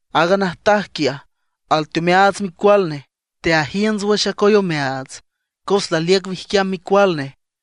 Aaga najtaj quiaj, alteomeaats micual nej, teajiünts wüx acoy omeaats cos laliüc wijquiam micual nej.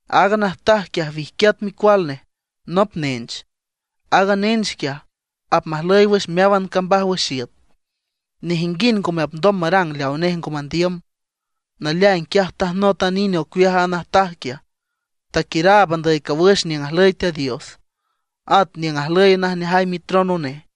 Aaga najtaj quiaj, wijquiat micual nej, nop nench. Aaga nench quiaj, apmajlüy wüx meáwan cambaj wüx iüt; nejinguind ngome apndom marang leawa nej ngo mandiüm. Naleaing quiaj tajnot a nine ocueaj aaga najtaj quiaj, taquiüraab andüy cawüx niüng ajlüy Teat Dios, at niüng ajlüy najneajay mitrono nej.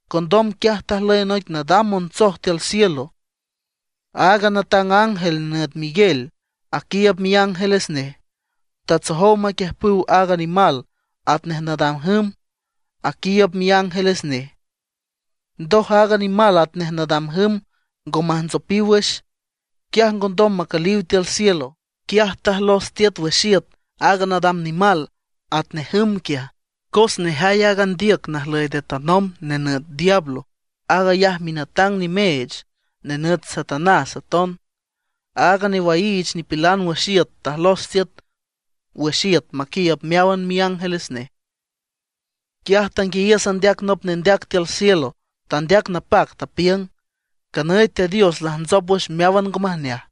Condom quiaj tajlüy noic nadam montsoj tiül cielo; aaga natang ángel nenüt Miguel aquiiüb miángeles nej, tatsojow maquiüjpüw aaga nimal atnej nadam jüm, aquiiüb miángeles nej. Ndoj aaga nimal atnej nadam jüm ngo majntsopiw wüx; quiaj ngondom macüliw tiül cielo. Quiaj tajlos tiüt wüx iüt aaga nadam nimal atnej jüm quiaj. Cos nejay aaga ndiüc najlüy nde tanomb nenüt diablo, aag ayaj minatang nimeech, nenüt Satanás aton. Aaga newaiich nipilan wüx iüt tajlos tiüt wüx iüt maquiiüb meáwan miángeles nej. Quiaj tanguiayiüs andeac nop nendeac tiül cielo; tandeac napac, tapiüng: ―Canüy Teat Dios lajntsop wüx meáwan ngo majneaj.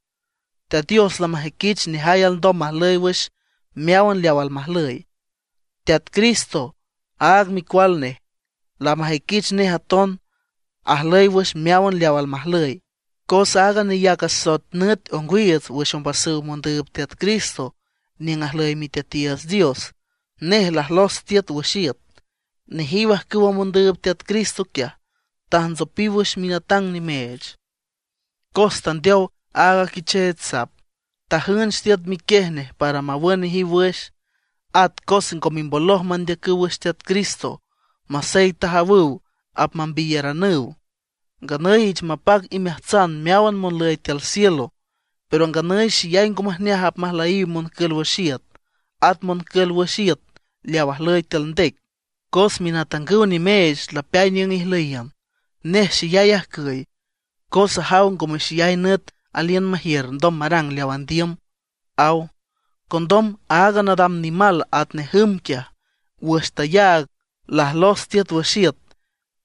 Teat Dios lamajüiquich nejay alndom majlüy wüx meáwan leaw almajlüy. Teat Cristo, aag micual nej, lamajüiquich nej aton ajlüy wüx meáwan leaw almajlüy; cos aaga neyac asoet nüt ongwiiüts wüx ombasüw mondüüb Teat Cristo niüng ajlüy Miteatiiüts Dios, nej lajlos tiüt wüx iüt. Nejiw ajcüwa mondüüb Teat Cristo quiaj, tajntsopiw wüx minatang nimeech, cos tandeow aaga Quicheech Sap, tajünch tiüt miquiej nej para mawün nejiw wüx. At cos ngo mimboloj mandeacüw wüx Teat Cristo masey tajawüw apmambiyaranüw. Nganüy ich mapac imeajtsan meáwan monlüy tiül cielo. Pero nganüy xeyay ngo majneaj apmajlüyiw moncül wüx iüt, at moncül wüx iüt leaw ajlüy tiül ndec, cos minatangüw nimeech lapeay niüng ijlüyiün. Nej xeyay ajcüy, cos ajaw ngome xeyay nüt aliün majiür ndom marang leaw andiüm ―aw. Condom aaga nadam nimal atnej jüm quiaj, wüx tayaag lajlos tiüt wüx iüt,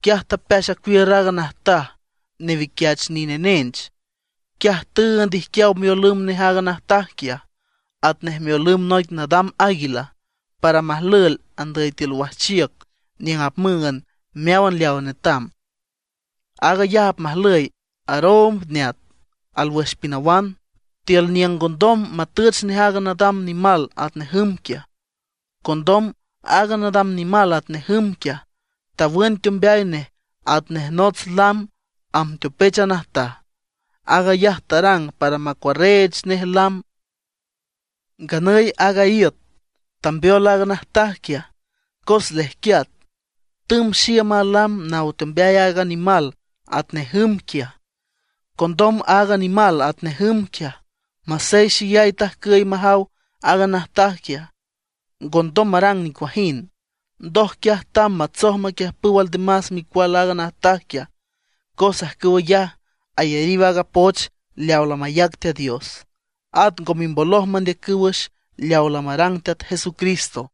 quiaj tapeax acuiür aaga najtaj newiquiach nine nench. Quiaj tüünd ijquiaw miolümb nej aaga najtaj quiaj, atnej miolümb noic nadam águila, para majlüel andüy tiül wajchiüc niüng apmüünd meáwan leaw netam. Aag ayaj apmajlüy aroomb neat alwüx pinawan, tiül niüng ngondom matüch nej aaga nadam nimal atnej jüm quiaj. Condom aaga nadam nimal atnej jüm quiaj, tawün teombeay nej atnej nots lam amb teopech a najtaj. Aag ayaj tarang para macuarreech nej lam. Nganüy aaga iüt tambeol aaga najtaj quiaj, cos lejquiat, tümb xiüm a lam naw teombeay aaga nimal atnej jüm quiaj. Condom aaga nimal atnej jüm quiaj, masey xeyay tajcüy majaw aaga najtaj quiaj, ngondom marang nicuajind. Ndoj quiaj tamb matsoj maquiüjpüw aldemas micual aaga najtaj quiaj. Cos ajcüw ayaj ayariw aaga poch leaw lamayac Teat Dios; at ngo mimboloj mandeacüw wüx leaw lamarang Teat Jesucristo.